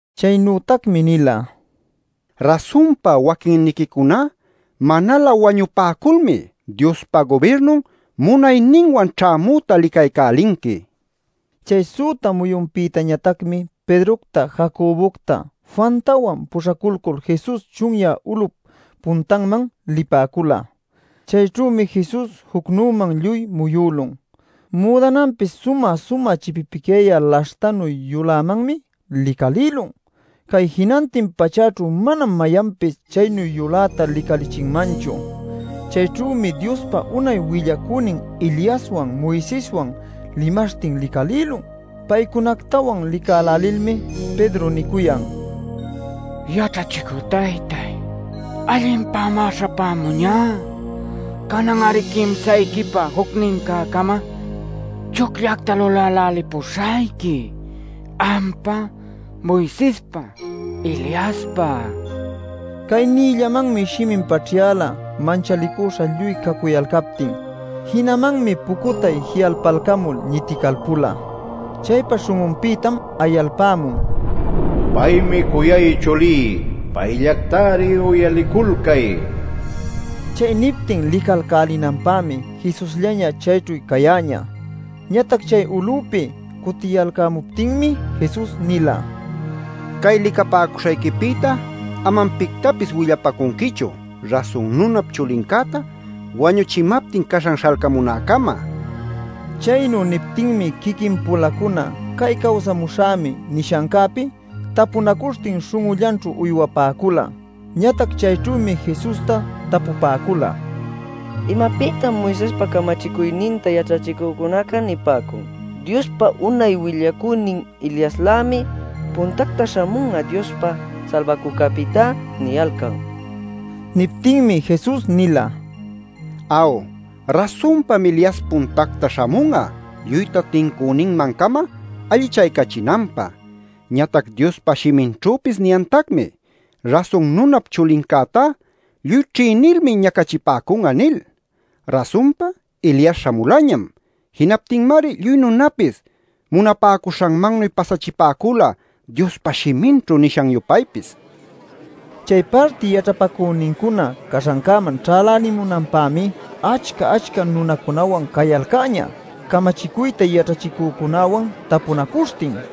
Chaynütacmi nila: “Rasunpa waquinniquicuná manalä wañupäculmi Diospa gubirnun munayninwan ćhämüta licaycälinqui” nil. Chay süta muyunpïtañatacmi Pedrocta, Jacobocta, Juantawan puśhaculcul Jesus chunyä ulup puntanman lipäcula. Chayćhümi Jesus jucnüman lluy muyülun. Müdananpis sumä-sumä chipipicyayä laśhtanu yulämanmi licalïlun. Cay jinantin pachächu manam mayanpis chaynu yulätá licalichinmanchu. Chayćhümi Diospa unay willacünin Eliaswan Moiseswan limaśhtin licalïlun. Paycunactawan licälälilmi Pedro nicuyan: “Yaćhachicü taytáy, allinpämá śhapämuñá. Canan-ari quimsayquipä jucnincä-cama chucllacta lulälälipuśhayqui, ampä, Moisespä, Eliaspä” nil. Cay niyllamanmi shimin paćhyala manchalicüśha lluy cacuyalcaptin. Jinamanmi pucutay ji'alpalcamul ñiticalpula. Chaypa śhun'unpïtam ayalpämun: “Paymi cuyay chulí. Payllactari uyaliculcay” nil. Chay niptin licalcälinanpämi Jesusllaña chayćhu cayäñä. Ñatac chay ulupi cutiyalcämuptinmi Jesus nila: “Cay licapäcuśhayquipïta amam pictapis willapäcunquichu Rasun Nunap Chulincäta wañuchipämaptin caśhan śhalcamunäcama” nil. Chaynu niptinmi quiquin-pulacuna cay “cawsamuśhämi” nishancäpi tapunacuśhtin śhun'ullanćhu uywapäcula. Ñatac chayćhümi Jesusta tapupäcula: “¿Imapïtam Moisespa camachicuyninta yaćhachicücunaca nipäcun: ‘Diospa unay willacünin Eliaslämi puntacta śhamun'a Diospa Salbacücäpïtá’ niyalcan?” nil. Niptinmi Jesus nila: “Aw, rasunpam Elias puntacta śhamun'a lluyta tincüninmancama allichaycachinanpä. Ñatac Diospa shiminćhüpis niyantacmi: ‘Rasun Nunap Chulincätá lluy ćhïnilmi ñacachipäcun'a’ nil. Rasunpa Elias śhamulañam. Jinaptinmari lluy nunapis munapäcuśhanmannuy pasachipäcula Diospa shiminćhu nishan-yupaypis” nil. Chay parti yaćhapacünincuna caśhancäman ćhälälimunanpämi achca-achca nunacunawan cayalcäñä, camachicuyta yaćhachïcücunäwan tapunacuśhtin.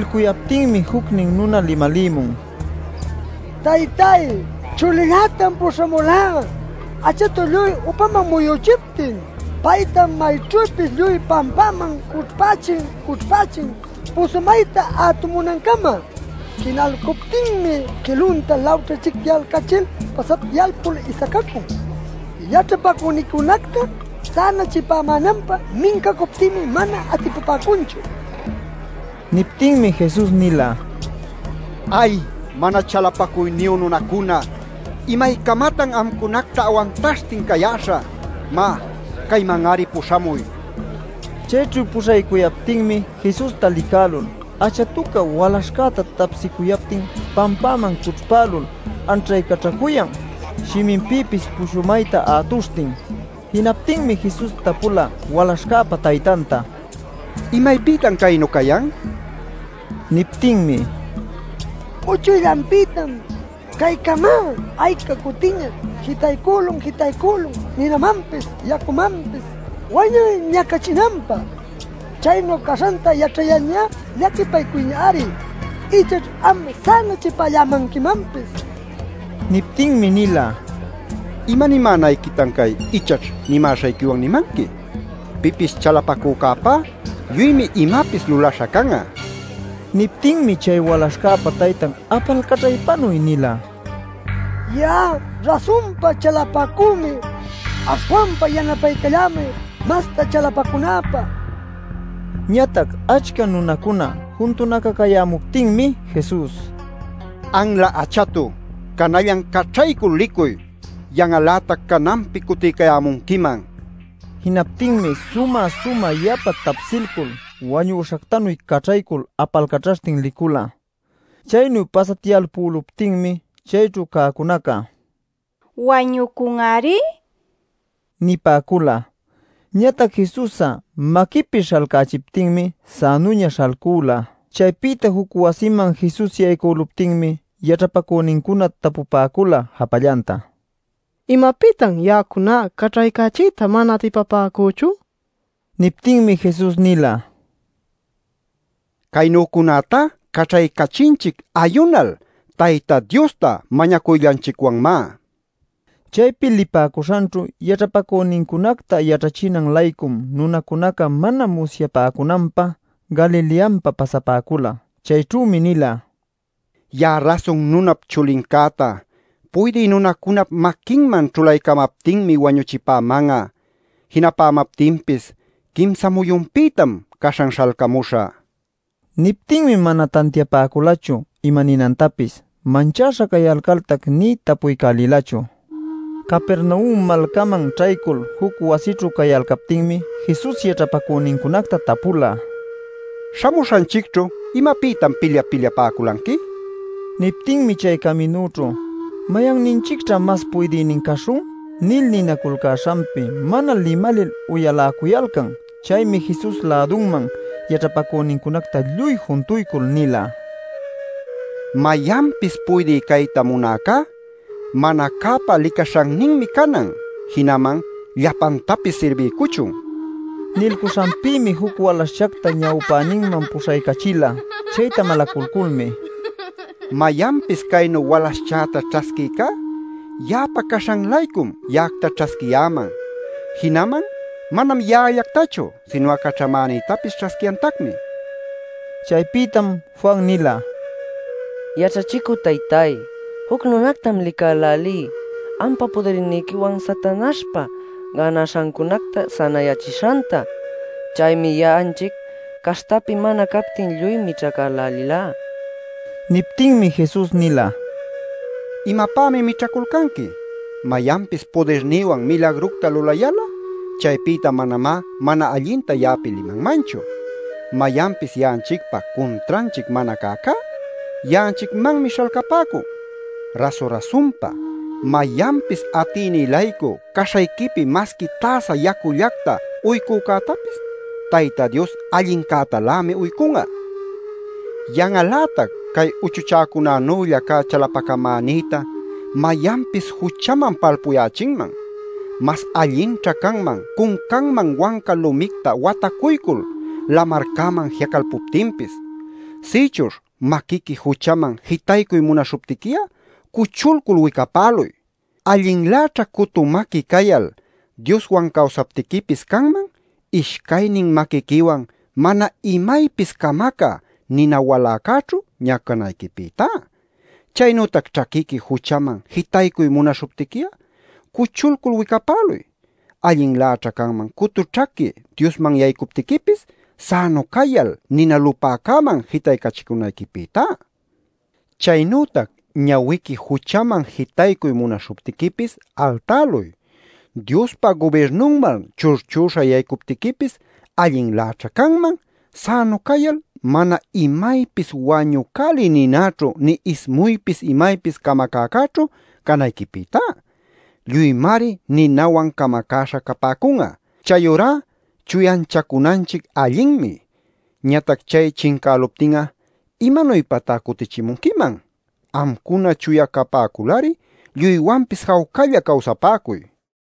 Nilcuyaptinmi jucnin nuna limalïmun: “Taytáy, chulillätam puśhamulá achatu lluy upaman muyüchiptin. Paytam mayćhüpis lluy pampaman cućhpächin-cućhpächin pushumayta ätumunancama. Jinalcuptinmi quilunta lawćhićhicyalcachil pasatyalpul isacacun. Yaćhapacüniquicunacta sänachipamänanpä mincacuptïmi mana atipapäcunchu” nil. Niptinmi Jesus nila: “¡Ay, mana chalapacuyniyu nunacuna! ¿Imaycamatan amcunacta awantaśhtin cayäśhä? Má, cayman-ari puśhamuy” nil. Chayćhu puśhaycuyaptinmi Jesusta licalcul achatuca walaśhcäta tapsicuyaptin pampäman cućhpälul anćhaycaćhacuyan shiminpïpis pushumayta ätuśhtin. Jinaptinmi Jesus tapula walaśhcäpa taytanta: “¿Imaypïtam caynu cayan?” nil. Niptinmi: “Uchuyllanpïtam. Caycamá ayca cutiñaćhá jitaycülun jitaycülun ninamanpis yacumanpis wañuy ñacachinanpä. Chaynu caśhanta yaćhayalñá llaquipaycuy-ari. Ichaćh am'a sänachipallämanquimanpis” nila. Niptinmi nila: “¿Imanimänayquitam cay ‘ichaćh’ nimäśhayquiwan nimanqui? Pipis chalapacücäpá lluymi imapis lulaśha can'a” nil. Niptinmi chay walaśhcäpa taytan apalcaćhaypanuy nila: “Ya'a rasunpa chalapacümi; aśhwanpa yanapaycallämay masta chalapacunäpä” nil. Ñatac achca nunacuna juntunacacayämuptinmi Jesus: “Anla achatu, canallan caćhaycul licuy. Yan'al-lätac cananpi cutiycayämunquiman” nil alapacüla. Jinaptinmi sumä-sumä yapa tapsilcul wañüśhactanuy caćhaycul apalcaćhaśhtin licula. Chaynu pasatyalpüluptinmi chayćhu cäcunaca: “Wañucun-ari” nipäcula. Ñatac Jesus'a maquipi śhalcalcächiptinmi sänuña śhalcüla. Chaypïta juc wasiman Jesus yaycüluptinmi yaćhapacünincuna tapupäcula japallanta: “¿Imapïtan ya'acuna caćhaycachiyta mana atipapäcüchu?” nil. Niptinmi Jesus nila: “Caynücunätá caćhaycachinchic ˻ayunal˼ Tayta Diosta mañacuyllanchicwanmá” nil. Chaypi lipäcuśhanćhu yaćhapacünincunacta yaćhachinan-laycum nunacunaca mana musyapäcunanpä Galileanpa pasapäcula. Chayćhümi nila: “Ya'a Rasun Nunap Chulincäta puydï nunacunap maquinman ćhulaycamaptinmi wañuchipäman'a. Jinapämaptinpis quimsa muyunpïtam caśhan śhalcamuśhä” nil. Niptinmi mana tantiapäculachu imaninantapis, manchäśha cayalcaltac nï tapuycälïlachu. Capernaum malcaman ćhaycul, juc wasićhu cayalcaptinmi Jesus yaćhapacünincunacta tapula: “¿Śhamuśhanchicćhu imapïtan pilyap-pilyapäculanqui?” nil. Niptinmi chay caminućhu “¿Mayanninchicćha mas puydïnin caśhun?” nil ninaculcäśhanpi mana limalil uyaläcuyalcan. Chaymi Jesus lädunman yaćhapacünincunacta lluy juntuycul nila: “Mayanpis puydï cayta munäcá, mana cäpa licaśhanninmi canan; jinaman llapantapis sirbiycuchun” nil. Nilcuśhanpïmi juc walaśhchacta ñawpäninman puśhaycachila. Chayta malaculculmi: “Mayanpis caynu walaśhchäta ćhasquïcá ya'apa caśhan-laycum ya'acta ćhasquiyäman. Jinaman manam ya'allactachu, sinu'a caćhamänïtapis ćhasquiyantacmi” nila. Chaypïtam Juan nila: “Yaćhachicü taytáy, juc nunactam licälälí ampa pudirniquiwan Satanaśhpa gänaśhacunacta sänayächishanta. Chaymi ya'anchic caśhtapi mana captin lluy mićhacälälilá” nil. Niptinmi Jesus nila: “¿Imapämi mićhaculcanqui? Mayanpis pudirnïwan milagructa lulayal'a chaypïta manamá mana allinta ya'api limanmanchu. Mayanpis ya'anchicpa cuntranchic mana cäcá ya'anchicmanmi śhalcapäcun. Rasu-rasunpa, mayanpis atïnï-laycu caśhayquipi masqui täsa yacullacta uycücätapis Tayta Dios allincätalämi uycun'a. “Yan'al-lätac cay uchuchäcunanülla cä chalapacamänïta mayanpis juchaman palpuyächinman. Mas allinćha canman cuncanman wanca lumicta watacuycul lamarcäman ji'acalpuptinpis. Sïchuśh maquiqui juchaman jitaycuy munaśhuptiqui'a cuchulcul wicapäluy. Allinläćhá cutu maqui cayal Dioswan cawsaptiquipis canman ishcaynin maquiquiwan mana imaypis camacä nina waläcäćhu ñacanayquipïtá. Chaynütac ćhaquiqui juchaman jitaycuy munaśhuptiqui'a cuchulcul wicapäluy. Allinläćhá canman cutu ćhaqui Diosman yaycuptiquipis, sänu cayal nina lupäcäman jitaycachicunayquipïtá. Chaynütac ñawiqui juchaman jitaycuy munaśhuptiquipis altäluy. Diospa gubirnunman churchüśha yaycuptiquipis allinläćhá canman, sänu cayal mana imaypis wañucälï ninaćhu nï ismuypis imaypis camacäcäćhu canayquipïtá. Lluymari ninawan camacäśha capäcun'a. “Chayurá chuyanchacunanchic allinmi. Ñatac chay chincäluptin'a ¿imanuypatá cutichimunquiman? Amcuna chuya capäculari lluywanpis jawcalla cawsapäcuy” nila.